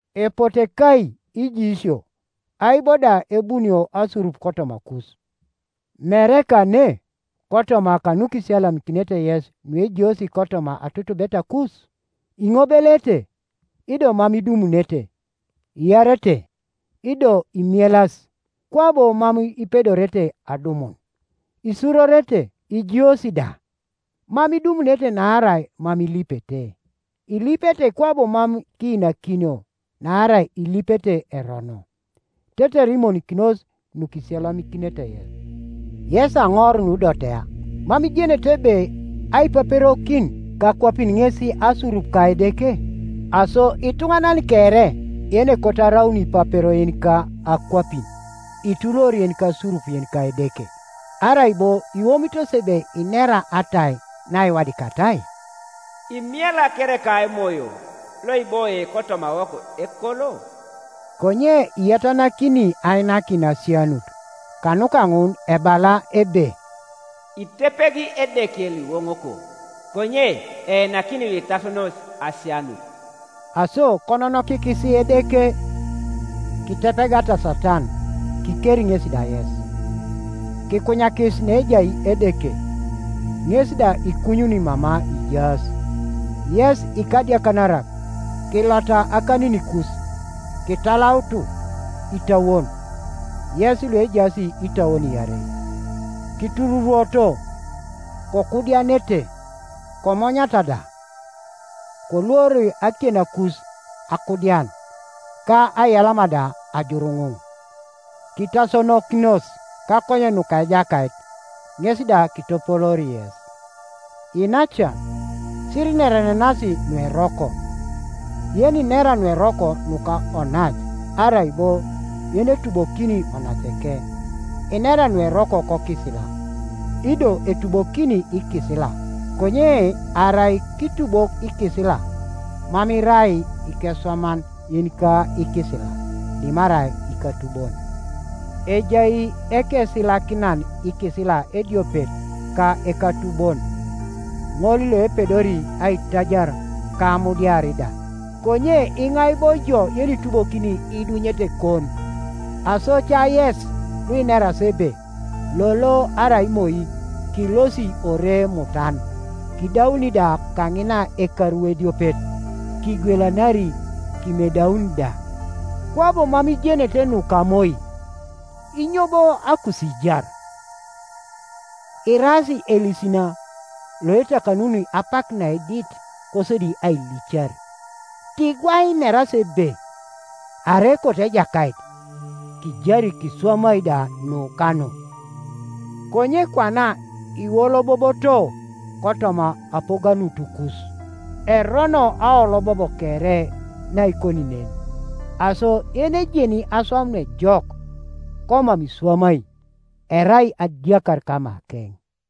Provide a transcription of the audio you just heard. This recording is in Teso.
Epote kai ijiisio, ai bo da ebunio asurup kotomakus? Mere kane, kotoma kanukisiyalamikinete yes nuejiosi kotoma atutubetakus? Iŋobeleete, ido mam idumunete; iarete, ido imielas, kwabo mam ipedorete adumun. Isurorete, ijiosi da, Mam idumunete naarai mam ilipete. Ilipete, kwabo mam kiinakinio, naarai ilipete erono, tetere imonikinos nukisiyalamikinete yes. Yes aŋor nudotea, mam ijenete ebe aipaperokin kakwapin ŋes asurup ka Edeke? Aso ituŋanan kere yenekot araun ipapero yenika akwapin ituluor yenikasurup yenika Edeke. Arai bo iwomitos ebe inera atai naiwadikatai? Imiela kereka emoyo loiboie kotomawok ekolo? Konye iyatanakini ainakin asianut. Kanuka ŋun ebala ebe, “Itepegi Edeke luiwoŋoko, konye einakini luitasonos asianut.” Aso kononokikis Edeke. Kitepegata Satan, kikeri ŋesi da yes. Kikunyakis neejai Edeke, ŋes da ikunyuni mama ijaas. Yes ikadiakanarak, kilota akaninikus, kitalautu itauon, yes luejaas itauon iarei. Kitururuoto, kokuudianete, komonyata da. Koluor akienakus akuudian, ka aiyalama da ajuruŋuŋ. Kitasonokinos kakonyen nuka Ejakait, ŋes da kitopoloori yes. Iinacan, sirinerenenas nueroko. Yeninera nueroko nuka onac, arai bo yenetubokini onaceke, inera nueroko kokisila, ido etubokini ikisila. Konye arai kitubok ikisila, mam irai ikeswaman yenika ikisila, dimarai ikatubon. Ejai ekesilakinan ikisila ediopet ka ekatubon, ŋol loepedori aitajar ka amudiar da. Konye iŋai bo ijo yenitubokini iidunyetekon? Aso ca yes luineras ebe, “Lolo arai moi kilosi ore mutan, kidauni da kaŋina ekaru ediopet, kigwelanari kimedaun da,” kwabo mam ijenete nuka moi. Inyo bo akusiijar? Iraas elisina, loetakanuni apak naedit, kosodi ailicar. Ti gwai ineras ebe, “Arai ekoto Ejakait, kijari kiswamai da nu ka nu.” Konye kwana iwoloboboto kotoma apoganutukus. Erono aolobob kere naikoni nen. Aso yenejeni aswam nuejok, komam iswamai, erai adiakar kamakeŋ.